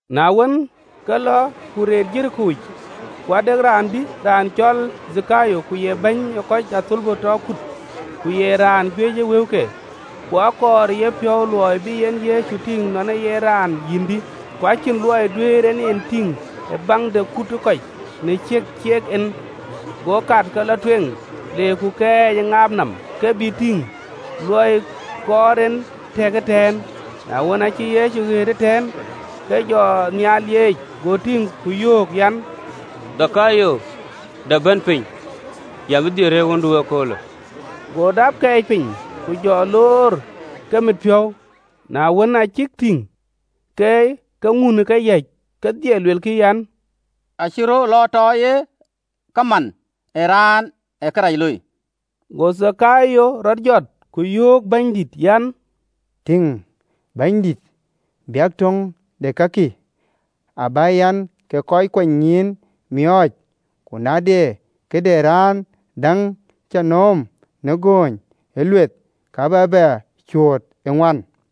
Na wën, ke lɔ ku reet Jeriko yic. Ku ade raan, dï, raan cɔl Dhakayo, ku ye bɛ̈ny ee kɔc ë athölbö tɔ kut, ku ye raan juëc ë wëuke. Ku akɔɔr ë yepiɔ̈u luɔi bï en Yecu tïŋ nɔn ee yen raan yïndï, ku acïn luɔi duëër en e tïŋ ë baŋ de kut ë kɔc, në ciɛk cek en. Go kat, ke lɔ tueŋ, le kɛɛc ë ŋaap nɔm, ke bïï tïŋ: luɔi kɔɔr en tëëk ëtɛ̈ɛ̈n. Na wën, aacï Yecu ɣet ëtɛ̈ɛ̈n, ke jɔ nhial lieec, go tïŋ ku yöök an, “Dhakayo, dap bɛ̈n piny, yɛn bï dhil rëër ɣöndu ee köölë.” Go dap kɛɛc piny, ku jɔ loor ke mit piɔ̈u. Na wën, aa cïk e tïŋ ke ke ŋun ë keyäc kedhie, luelkï an, “Acï rɔt lɔ tɔ ye kaman ë raan ee kërac looi.” Go Dhakayo rɔt jɔt, ku yöök Bɛ̈nydït an, “Tïŋ, Bɛ̈nydït, biäk töŋ de kakï abä yɛn ke kɔc kuanynyïïn miɔɔc, ku na de këde raan däŋ cä nööm në gööny ë lueth, ka bä bɛ cuööt ë ŋuan.”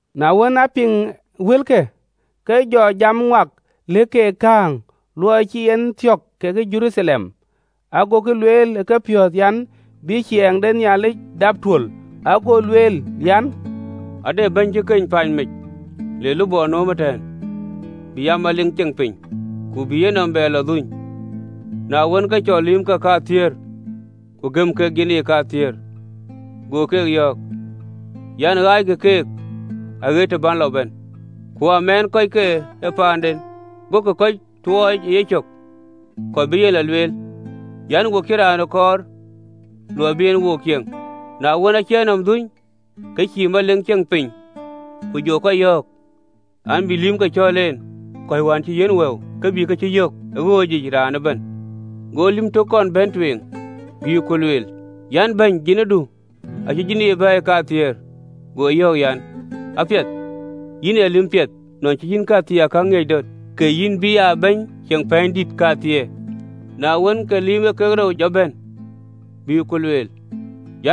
Na wën, aa piŋkï wëlkë, ke jɔ jam ŋuak lëk keek kääŋ, luɔi cï en thiɔ̈k ke Jeruthalem, agokï lueel, ë kepiɔ̈ɔ̈th an, bï ciɛɛŋ de Nhialic dap tuöl. Ago lueel an, “Ade bɛ̈ny cï keny paan mec, le lupɔ nööm ëtɛ̈ɛ̈n, bï aa melik de ciɛɛŋ, ku bï yenɔm bɛ lɔ dhuny. Na wën, ke cɔl lïïmke kathiëër, ku gëm keek jinii kathiëër, go keek yɔ̈ɔ̈k an, ‘Ɣaackï keek aɣet të bän lɔ bɛ̈n.’ Ku amɛɛn kɔc ke paanden, gokï kɔc tuɔɔc ë yecök, kɔc bï e lɔ lueel an, ‘Wo cïï raanë kɔɔr luɔi bï en wo cieŋ.’ “Na wën, aacï e nɔm dhuny, ke cï aa melik de ciɛɛŋ, ku jɔ kɔc yɔ̈ɔ̈k an, bï lïïmke cɔ̈l en, kɔc wään cï yiɛ̈n wëu, ke bï kë cïk yök ë ɣööc ŋic, raan ëbɛ̈n. Go lïm tök kɔn bɛ̈n tueŋ, bï ku lueel an, ‘Bɛ̈ny, jinidu acï jinii bɛ̈ɛ̈i kathiëër.’ Go yɔ̈ɔ̈k an, ‘Apiɛth, yïn ee lïm piɛth: nɔn cï yïn këthiinakäŋ ŋiëc döt, ke yïn bï aa bɛ̈ny ceŋ pɛ̈ɛ̈nydït kathiëër.’ Na wën, ke lïm ee kek rou jɔ bɛ̈n, bï ku lueel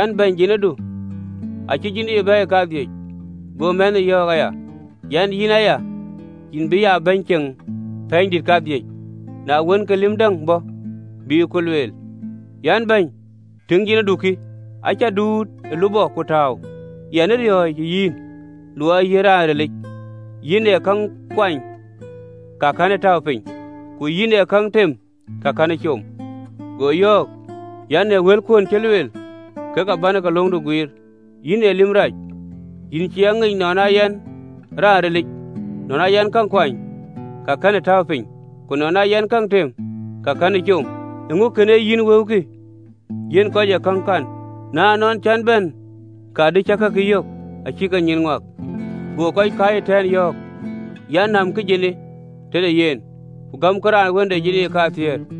an, ‘Bɛ̈ny, jinidu acï jinii bɛ̈ɛ̈i kadhïc.’ Go mɛnhë yɔ̈ɔ̈k aya an, ‘Yïn aya yïn bï aa bɛ̈ny ceŋ pɛ̈ɛ̈nydït kadhïc.’ Na wën, ke lïm däŋ bɔ̈, bï ku lueel an, ‘Bɛ̈ny, tïŋ, jinidu kï, acä duut ë lupɔ ku tääu, yɛn ë riɔ̈ɔ̈c ë yïn, luɔi ee yïn raan rilic, yïn ee käŋ kuany ka kɛ̈në tääu piny, ku yïn ee käŋ tem ka kɛ̈në com.’ Go yɔ̈ɔ̈k an, ‘Në wëlkuön cï lueel, kek abän ke löŋdu guiir, yïn ee lïm rac. Yïn cï a ŋic nɔn aa yɛn raan rilic, nɔn aa yɛn käŋ kuany ka kɛ̈n tääu piny, ku nɔn aa yɛn käŋ tem ka kɛ̈n com: eeŋö kën yïn wëukï yiɛ̈n kɔc ë käŋ kan na ënɔɔn cän bɛ̈në, ka dï cä kakï yök acï ke nyïïn ŋuak?’ Go kɔc kääc ëtɛ̈ɛ̈n yɔ̈ɔ̈k an, ‘Nämkï jinii tëde yen, ku gämkï raan wën de jinii kathiëër!’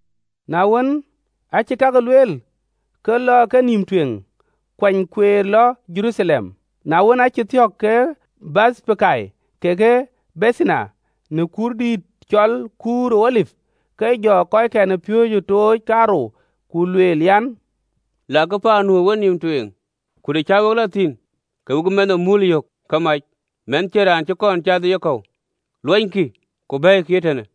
Na wën, aacï kakë lueel, ke lɔ ë kenïïm tueŋ, kuany kueer lɔ Jeruthalem. Na wën, aacï thiɔ̈k ke Bethpage kekë Bethani, në kuurdïït cɔl kuur ë Olip, ke jɔ kɔckɛn ë piööcë tooc kaarou, Ku lueel an, “Lakï paan nu ë wenïïm tueŋ, ku të cä we lɔ thïn, ke we bï mɛnh ë muul yök ke mac, mɛnh cïn raan cï kɔn cath ë yekɔ̈u: luɔnykï, ku bɛ̈ɛ̈ikï ee tënë.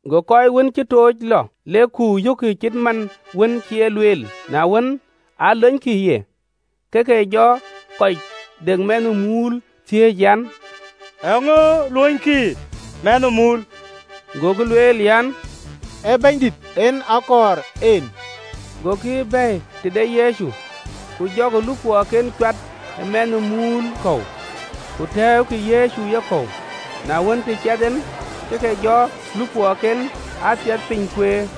Go kɔc wën cï tooc lɔ, lek ku yökkï ke cït man wën cï en e lueel. Na wën an, lonykï ye, ke ke jɔ kɔc de mɛnh ë muul thiëëc an, “Eeŋö luönykï mɛnh ë muul?” Gokï lueel an, “Ee Bɛ̈nydït en akɔɔr en.” Gokï bɛ̈ɛ̈i tëde Yecu: ku jɔkï lupɔɔken cuat ë mɛnh ë muul kɔ̈u, ku tɛ̈ɛ̈ukï Yecu ë yekɔ̈u. Na wën, të ciɛth en, ke ke jɔ lupɔɔken aa thiɛth piny kueer.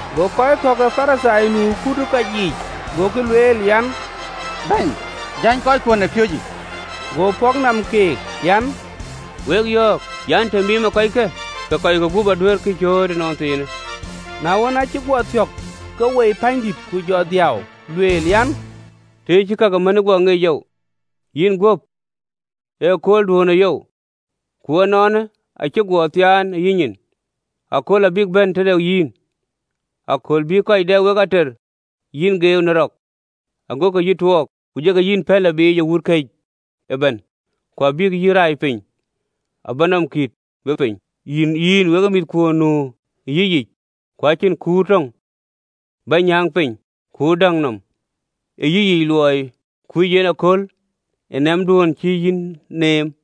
Go kɔc kɔ̈k ke Parithai nu ë kut ë kɔc yiic, gokï lueel an, “Bɛ̈ny, jäny kɔckuön ë piööcë!” Go pɔ̈k nɔm keek an, “Wek yɔ̈ɔ̈k an, të miimë kɔckë, ke kɔi gup aduëërkï cööt ënɔnthiinë.” Na wën, aacï guɔ thiɔ̈k, ke woi pänydït, ke jɔ dhiau, Lueel an, “Tëë yï cï ka ke mändu guɔ ŋic oou, yïn guöp, ëköölduönë yoou! Ku ënɔɔnë, acï ke guɔ thiaan ë yïnyin. Akööl abïk bɛ̈n tëde yïn, akööl bï kɔc dɛ wek ater yï geeu në rek, agokï yï tuɔɔk, ku jɔkï yï pɛ̈n lɔ biic ë wut këc ëbɛ̈n. Ku abïk yï rai piny abä nɔm kït we piny, yïn wekë mïthkuön nu ë yïyic, ku acïn kuur töŋ bïk nyääŋ piny ë kuur däŋ nɔm ë yïyic, luɔi kuc yïn kööl ë nɛ̈mduön cï yï neem!”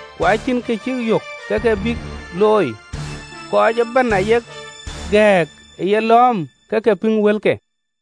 Ku acïn kë cïk yök kë bïk looi: kɔc ëbɛ̈n ayek gɛ̈ɛ̈k ë yelɔ̈ɔ̈m, ke ke piŋ wëlke.